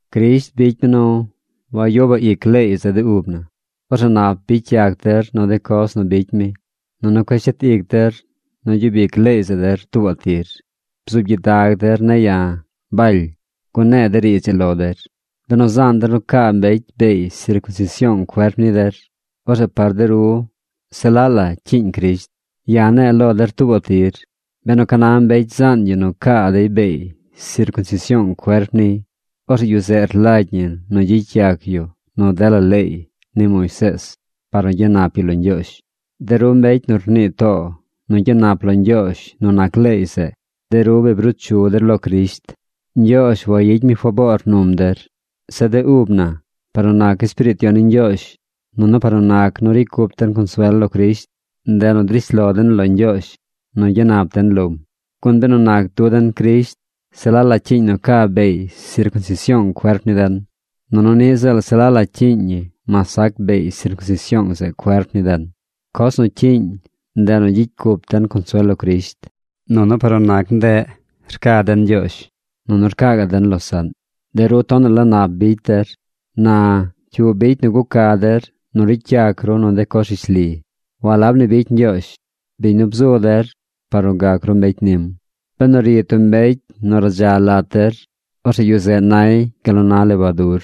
Crisht bicy mi nu wayubaꞌ ic leey zeꞌ de ub na. Orzeꞌ nap bicy yac der nu de coz nu bicy mi, nunu cueꞌ shet ic der nu gyub ic leey zeꞌ der tuubaꞌ tir. Bzuub gyidag der ne̱ ya̱, Baly, gun ne̱e̱ de riidz ii lo der: Benu zaan der nu caa mbecy beey sircunsision cuerp ni der, orzeꞌ par de ru se laꞌ la cyiiñ Crisht. Ya̱ ne̱e̱ lo der tuubaꞌ tir: Benu ca na mbecy zaan yu nu caa dey beey sircunsision cuerp niy, orzeꞌ yu zeꞌ rlagy ñi nu gyicy yac yu nu dela leey ni Moisees par nu gyanap yu lo Ñgyoozh. De ru mbecy nu rnii too nu gyanap lo Ñgyoozh nu nac leey zeꞌ, de ru bi bruu chu der lo Crisht. Ñgyoozh wayicy mi faboor num der. Zeꞌ de ub na, par nu nac Espiriit Yon ni Ñgyoozh nunu par nu nac nu ricy cup den consuel lo Crisht, ndeꞌ nu drish lo den lo Ñgyoozh nu gyanap den lom. Gun benu nac du den Crisht, se la la cyiiñ nu ca beey sircunsision cuerp ni den, nunu niꞌ ziꞌl se la la cyiiñ ñi mas sac beey sircunsision zeꞌ cuerp ni den. Coz nu cyiiñ, ndeꞌ nu gyicy cup den consuel lo Crisht. Nunu par nu nac ndeꞌ rca den Ñgyoozh, nunu rcaa gaꞌ den losaꞌn. De ru tonaꞌ la nap bicy der. Na, ¿cyu bicy nu guca der nu ricy yac ru nu de coz rishli? Walab ni bicy Ñgyoozh, biñ nu bzu der par nu gac ru mbecy nim. Benu ri tub mbecy nu radza lat der, orzeꞌ yu zeꞌ nay gal nu na lebadur.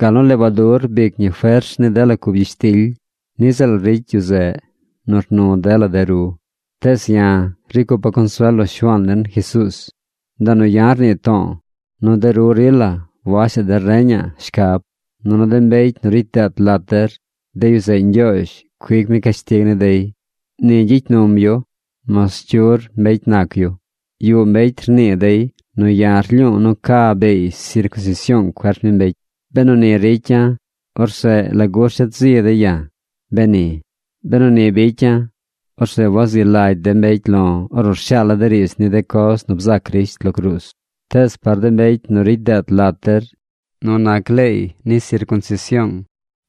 Gal nu lebadur rbic ñi fers ni dela cub gyishtily, niꞌ ziꞌl ricy yu zeꞌ nu rnu dela de ru. Tees ya̱, ricy cupa̱ consuel lo Shuaan den Jesuuz. Ndeꞌ nu ya̱ rnii to̱o̱ nu de ru rila washaꞌ der reñaꞌ shcab, nunu de mbecy nu ricy deet lat der, de yu zeꞌ Ñgyoozh cuic mi cashtig ni dey. Ni gyicy num yu mas cyur mbecy nac yu. Yuꞌ mbecy rnii dey nu ya̱ rlyu̱u̱ nu ca beey sircunsision cuerp ni mbecy. Benu ni ricya̱, orzeꞌ ¿lagu rshet zi dey ya̱, beni? Benu ni bicya̱, orzeꞌ wazi lagy de mbecy lo̱ ornu rshaala̱ de riidz ni de coz nu bzac Crisht lo cruuz. Tees par de mbecy nu ricy deet lat der nu nac leey ni sircunsision,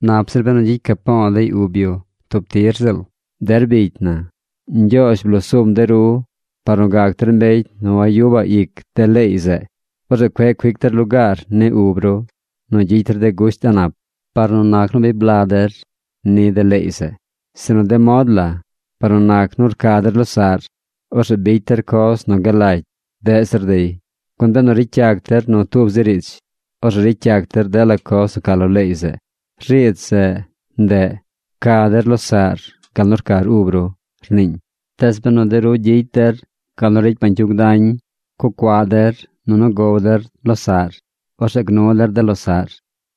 nap zir benu gyicy capo̱o̱ dey ub yu tub tir ziꞌl. Der bicy na, Ñgyoozh bloo sum de ru par nu gac der mbecy nu wayubaꞌ ic de leey zeꞌ. Orzeꞌ cueꞌ cuic der lugaar ni ub ru nu gyicy der de gusht a̱ꞌ nap, par nu nac nu bi bla der ni de leey zeꞌ. Sinu de mod la par nu nac nu rca der losaꞌr, orzeꞌ bicy der coz nu galagy deꞌ zir dey. Gun benu ricy yac der nu tub zi riidz, orzeꞌ ricy yac der dela coz nu ca lo leey zeꞌ. Riidz zeꞌ, ndeꞌ: “Pca der losaꞌr gal nu rcar ub ru”, rniiñ. Tees benu de ru gyicy der gal nu ricy bañcyug dañ, cucuaꞌ der nunu gow der losaꞌr, orzeꞌ gnu der de losaꞌr.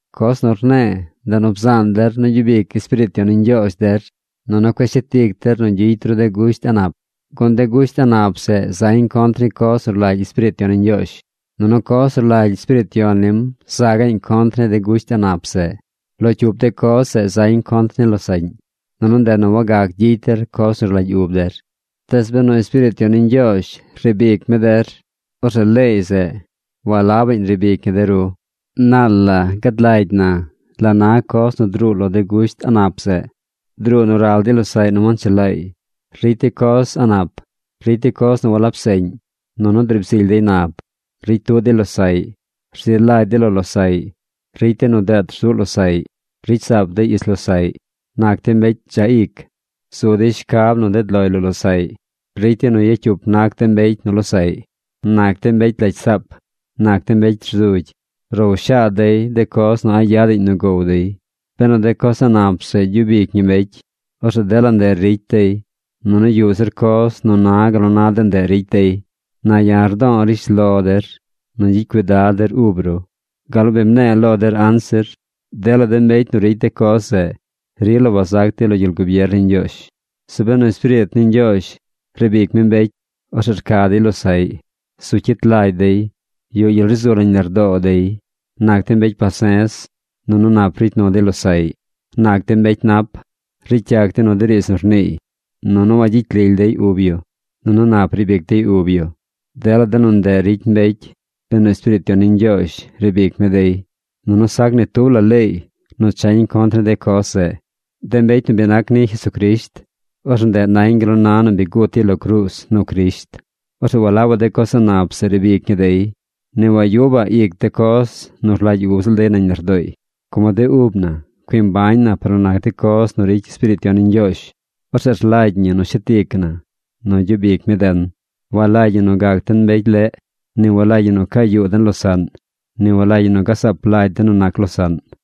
Coz nu rne̱e̱ ndeꞌ nu bzaan der nu gyub ic Espiriit Yon ni Ñgyoozh der nunu cueꞌ shet ic der nu gyicy ru de gusht a̱ꞌ nap. Gun de gusht a̱ꞌ nap zeꞌ zañ contr ni coz nu rlagy Espiriit Yon ni Ñgyoozh, nunu coz nu rlagy Espiriit Yon nim za gaꞌñ contr ni de gusht a̱ꞌ nap zeꞌ. Lo cyup de coz zeꞌ zañ contr ni losaꞌñ. Nunu ndeꞌ nu wagac gyicy der coz nu rlagy ub der. Tees benu Espiriit Yon ni Ñgyoozh riib ic mi de ru, orzeꞌ leey zeꞌ walabaꞌñ riib ic ñi der. Naal la gad lagy na la na coz nu druu lo de gusht a̱ꞌ nap zeꞌ. Druu nu ral dey losaꞌy nu wanchelaay, ricy dey coz a̱ꞌ nap, ricy dey coz nu walab seꞌñ. Nunu driib zily dey nab. Ricy tuꞌ dey losaꞌy. Rzi lagy dey lo losaꞌy. Ricy dey nu deet rzuꞌ losaꞌy. Ricy saap dey ich losaꞌy. Nac dey mbecy dzaꞌ ic. Zu dey shcab nu ded loy lo losaꞌy. Ricy dey nu yacyup nac de mbecy nu losaꞌy. Nac dey mbecy lagy saap. Nac dey mbecy rzugy. Row shaad dey de coz nu a̱ꞌ yadaꞌñ nu gow dey. Benu de coz a̱ꞌ nap zeꞌ gyub ic ñi mbecy, orzeꞌ dela ndeꞌ ricy dey, nunu yuꞌ zir coz nu na gal nu na de ndeꞌ ricy dey. Na ya̱ rdo̱o̱ rishlo der nu gyicy cuidad der ub ru, gal nu bi mne̱e̱ lo der anzir. Dela de mbecy nu ricy de coz zeꞌ rila wazac dey lo gyel gubier ni Ñgyoozh. Zeꞌ benu Espiriit ni Ñgyoozh riib ic mi mbecy, orzeꞌ rca dey losaꞌy. Zu cyit lagy dey. Yuꞌ gyel ri zu nañ lardoo dey. Nac dey mbecy pase̱z. Nunu nap ricy nu dey losaꞌy. Nac dey mbecy nap. Ricy yac dey nu de riidz nu rniiy. Nunu wagyicy lily dey ub yu. Nunu nap riib ic dey ub yu. Dela de nu ndeꞌ ricy mbecy benu Espiriit Yon ni Ñgyoozh riib ic mi dey. Nunu sac ni tub la leey nu chañ contr ni de coz zeꞌ. De mbecy nu bi nac ni Jesucrisht, orzeꞌ ndeꞌ nañ gal nu na nu bi gut dey lo cruuz nu Crisht. Orzeꞌ walabaꞌ de coz a̱ꞌ nap zeꞌ riib ic ñi dey. Ni wagyubaꞌ ic de coz nu rlagy ub ziꞌl dey nañ lardooy. Como de ub na cui mbañ na par nu nac de coz nu ricy Espiriit Yon ni Ñgyoozh, orzeꞌ rlagy ñi nu shet ic na nu gyub ic mi den. Walagy ñi nu gac den mbecy leꞌ. Ni walagy ñi nu caa yuu den losaꞌn. Ni walagy ñi nu gazaap lagy den nu nac losaꞌn.